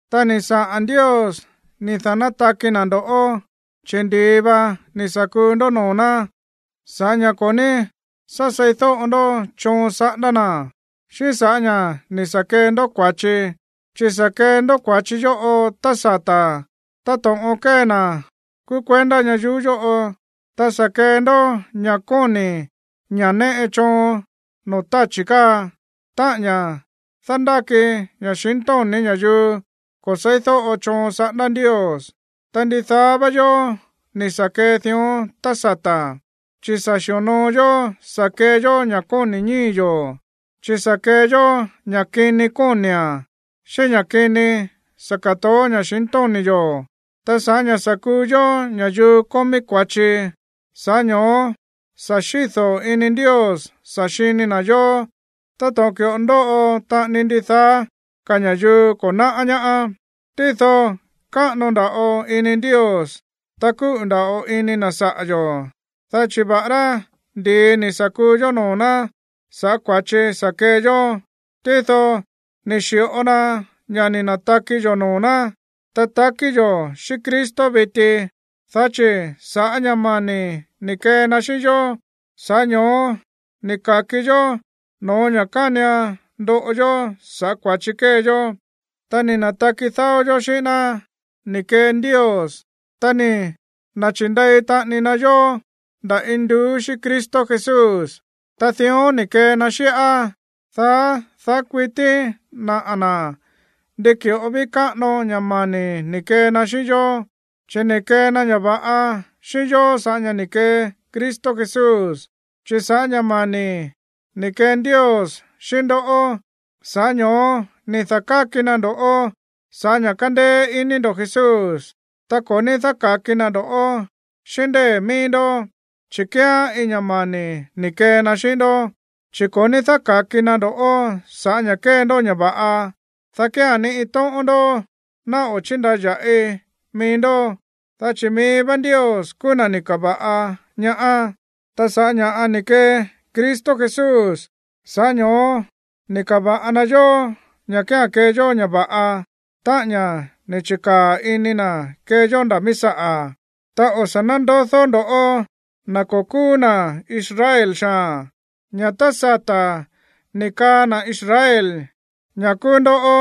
Ta ni̱ saꞌa̱n Ndios ni̱ da̱nátaki na̱ ndo̱ꞌó, chi̱ ndi̱i va ni̱ sa̱ kuu ndó noo̱ ná sa̱ꞌá ña̱ ko̱ ní sá seídóꞌo ndó choon saꞌándá na̱, xíꞌín sa̱ꞌá ña̱ ni̱ sa̱ kee ndó kua̱chi. Chi̱ sa̱ kee ndó kua̱chi yóꞌo tá sata̱ táto̱ꞌon kée na̱ kúú kuendá ñayuú yóꞌo, ta sa̱ kee ndó ña̱ kóni̱ ña̱ néꞌe choon noo̱ táchi̱ káa, táꞌa̱n ña̱ dándáki ña̱xintóni̱ ña̱yuu ko̱ se̱ídóꞌo choon saꞌándá Ndios. Ta ndidaá vá yó ni̱ sa̱ kee dión tá sata̱, chi̱ sa̱ xi̱onoo yó sa̱ kee yó ña̱ kóni̱ ñíi̱ yo̱, chi̱ sa̱ kee yó ña̱ kini kóni̱a̱n xíꞌín ña̱ kini sa̱ ka̱toó ña̱xintóni̱ yo̱. Ta sa̱ꞌá ña̱ sa̱ kuu yó ña̱yuu kómí kua̱chi, sa̱ꞌá ño̱ó sa̱ xído̱ ini Ndios sa̱ xini na̱ yó táto̱ꞌon ki̱ꞌo ndóꞌo taꞌani ndidaá ka̱ ña̱yuu ko̱ náꞌá ñaá. Tído káꞌano nda̱ꞌo ini Ndios, ta kúꞌu̱ nda̱ꞌo ini na̱ saꞌa̱ yo̱, dá chi̱ va̱ꞌará ndi̱i ni̱ sa̱ kuu yó noo̱ ná sa̱ꞌá kua̱chi sa̱ kee yó, tído ni̱ xi̱ꞌo na ña̱ ni̱ na̱taki yo̱ noo̱ ná, ta takí yo̱ xíꞌín Cristo viti. Dá chi̱ sa̱ꞌá ña̱ mani̱ ni̱ kee na xíꞌín yó, sa̱ꞌá ño̱ó ni̱ ka̱ki yó no̱ó ña̱ kánian ndoꞌo yó sa̱ꞌá kua̱chi kée yó. Ta ni̱ na̱taki dáó yó xíꞌín ná ni̱ kee Ndios, ta ni̱ na̱chi̱nde̱i taꞌani na yó nda̱ induú xíꞌín Cristo Jesús. Ta dión ni̱ kee na xíꞌá, dá daá kuití naꞌa̱ na̱ ndi ki̱ꞌo ví káꞌano ña̱ mani̱ ni̱ kee na xíꞌín yó, chi̱ ni̱ kee na ña̱ va̱ꞌa xíꞌín yó sa̱ꞌá ña̱ ni̱ kee Cristo Jesús. Chi̱ sa̱ꞌá ña̱ mani̱ ni̱ kee Ndios xíꞌín ndó, sa̱ꞌá ño̱ó ni̱ da̱káki na ndo̱ꞌó sa̱ꞌá ña̱ kándéé iní ndo̱ Jesús. Ta ko̱ ní dáka̱ki na ndo̱ xíꞌín ndée̱ mií ndó, chi̱ kíán iin ña̱ mani̱ ni̱ kee na xíꞌín ndó, chi̱ ko̱ ní dáka̱ki na ndo̱ꞌó sa̱ꞌá ña̱ kée ndó ña̱ va̱ꞌa, dá kía̱n ni iin tóꞌón ndó ná o̱ chíndaya̱ꞌi mií ndó. Dá chi̱ mií vá Ndios kúú na̱ ni̱ ka̱va̱ꞌa ñaá, ta sa̱ꞌá ña̱ ni̱ kee Cristo Jesús, sa̱ꞌá ño̱ó ni̱ ka̱va̱ꞌa na yó ña̱ kía̱n kee yó ña̱ va̱ꞌa, táꞌa̱n ña̱ ni̱ chi̱kaa̱ ini na̱ kee yó nda̱ míí saꞌa̱. Ta o̱ sa̱ nándodó ndo̱ꞌó, na̱ ko̱ kúú na̱ Israel xaa̱n, ña̱ tá sata̱ ni̱ kaa na̱ Israel ña̱ kúú ndoꞌó,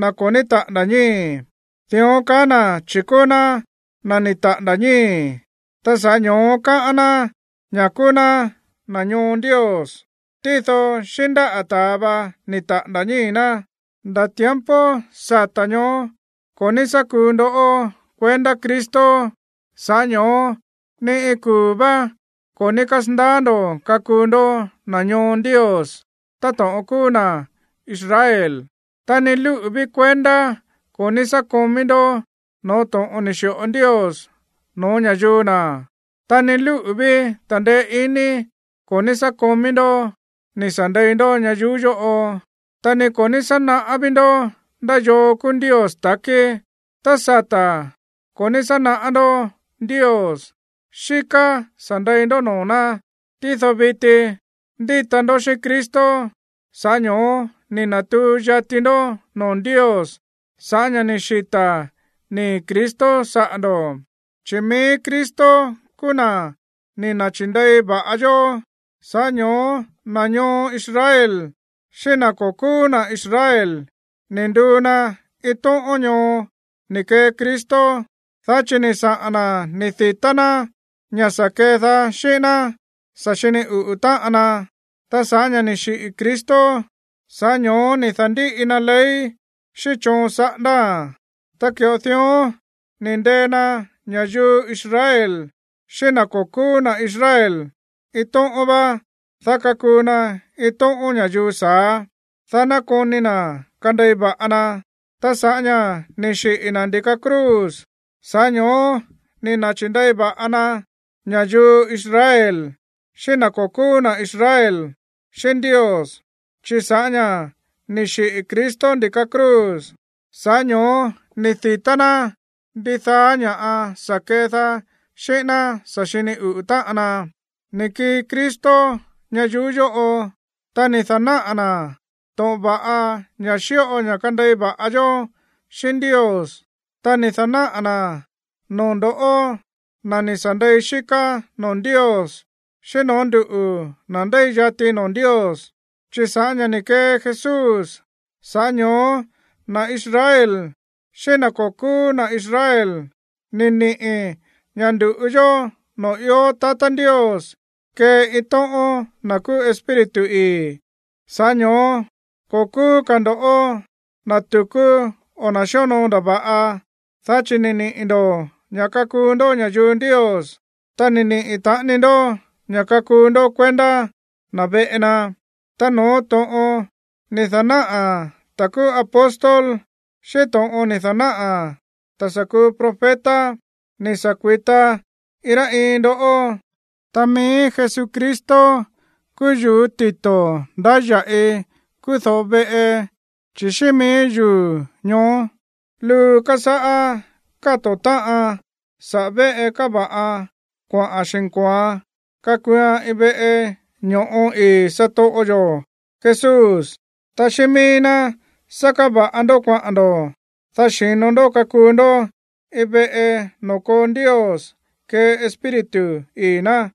“na̱ ko̱ ní taꞌa̱nda̱ ñíi̱.” Dión kaá na̱ chi̱ kúú ná na̱ ni̱ taꞌa̱nda̱ ñíi̱, ta sa̱ꞌá ño̱ó káꞌán ná ña̱ kúú ná na̱ ñoo Ndios, tído xíꞌín ndáꞌa̱ ta̱a va ni̱ taꞌa̱nda̱ ñíi̱ ná. Nda̱ tiempo sata̱ ñoó ko̱ ní sá kuu ndó kuendá Cristo, sa̱ꞌá ño̱ó ni iin kuu̱ vá ko̱ ní kasandaá ndo̱ kakuu ndó na̱ ñoo Ndios táto̱ꞌon kúú na̱ Israel. Ta ni lúꞌu̱ ví kuendá ko̱ ní sá komí ndó no̱ó to̱ꞌon ni̱ xi̱ꞌo Ndios no̱ó ña̱yuu na̱. Ta ni lúꞌu̱ ví ta̱ndeé iní ko̱ ní sá komí ndó ni̱ sa̱ ndei ndó ñayuú yóꞌo, ta ni ko̱ ní sá naꞌá ví ndó ndá yoo kúú Ndios ta̱kí. Tá sata̱ ko̱ ní sá naꞌá ndó Ndios, xíká sa̱ ndei ndó noo̱ ná. Tído viti, ndíta ndó xíꞌín Cristo, sa̱ꞌá ño̱ó ni̱ na̱tuu yati ndó noo̱ Ndios sa̱ꞌá ña̱ ni̱ xita̱ nii̱ Cristo saꞌa̱ ndo̱. Chi̱ mií Cristo kúú na̱ ni̱ na̱chi̱ndei va̱ꞌa yó, sa̱ꞌá ño̱ó na̱ ñoo Israel xíꞌín na̱ ko̱ kúú na̱ Israel, ni̱ nduu na iin tóꞌón ñoo ni̱ kee Cristo, dá chi̱ ni̱ saꞌa̱n na̱ ni̱ di̱tá ná ña̱ sa̱ kedaá xíꞌín ná sa̱ xini uꞌu̱ táꞌan na. Ta sa̱ꞌá ña̱ ni̱ xiꞌi̱ Cristo, sa̱ꞌá ño̱ó ni̱ da̱ndíꞌi na ley xíꞌín choon saꞌándáa̱n. Ta ki̱ꞌo dión ni̱ ndee na ña̱yuu Israel xíꞌín na̱ ko̱ kúú na̱ Israel iin tóꞌón vá, dá kakuu na iin tóꞌón ña̱yuu sa̱á, dá ná koni na̱ kandei va̱ꞌa na. Ta sa̱ꞌá ña̱ ni̱ xiꞌi̱ na̱ ndi̱ka cruz, sa̱ꞌá ño̱ó ni̱ na̱chi̱ndei va̱ꞌa na ña̱yuu Israel xíꞌín na̱ ko̱ kúú na̱ Israel xíꞌín Ndios, chi̱ sa̱ꞌá ña̱ ni̱ xiꞌi̱ Cristo ndi̱ka cruz, sa̱ꞌá ño̱ó ni̱ di̱tá ná ndidaá ña̱ sa̱ kedaá xíꞌín ná sa̱ xini uꞌu̱ táꞌan na. Ni̱ kii Cristo ñayuú yóꞌo, ta ni̱ da̱náꞌa̱ na̱ to̱ꞌon va̱ꞌa ña̱ xíꞌo ña̱ kandei va̱ꞌa yó xíꞌín Ndios, ta ni̱ da̱náꞌa̱ na̱án noo̱ ndo̱ꞌó, na̱ ni̱ sa̱ ndei xíká noo̱ Ndios, xíꞌín no̱ó nduꞌu̱, na̱ ndéi yati noo̱ Ndios. Chi̱ sa̱ꞌá ña̱ ni̱ kee Jesús, sa̱ꞌá ño̱ó na̱ Israel xíꞌín na̱ ko̱ kúú na̱ Israel ni̱ niꞌi̱ ña̱ ndu̱ꞌu yó noo̱ ió tatá Ndios kée iin tóꞌón na̱ kúú Espíritu ii̱. Sa̱ꞌá ño̱ó ko̱ kúú ka̱ ndo̱ na̱ tu̱kú o na̱ xíonoo ndava̱ꞌa. Dá chi̱ ni̱ niꞌi̱ ndo̱ ña̱ kakuu ndó ña̱yuu Ndios, ta ni̱ niꞌi̱ taꞌani ndó ña̱ kakuu ndó kuendá na̱ veꞌe na. Ta no̱ó to̱ꞌon ni̱ da̱náꞌa̱ na̱ kúú apóstol, xíꞌín to̱ꞌon ni̱ da̱náꞌa̱ na̱ sa̱ kuu profeta ni̱ sa̱ kui̱ta iin rá iin ndó. Ta mií Jesucristo kúú yu̱ú tito̱ ndáya̱ꞌi kúú do̱ꞌo veꞌe, chi̱ xíꞌín míí yuu̱ ñoó luu kasáꞌá káto̱ táꞌan saꞌa̱ véꞌe káva̱ꞌan kuaꞌa̱n xi̱nko̱oan kakuuan iin veꞌe ño̱ꞌo ii̱ satoꞌo yo̱ Jesús. Ta xíꞌín míí ná sá káva̱ꞌa ndó kuaꞌa̱n ndo̱, dá xi̱no ndó kakuu ndó iin veꞌe noo̱ koo Ndios kée Espíritu ii̱ ná.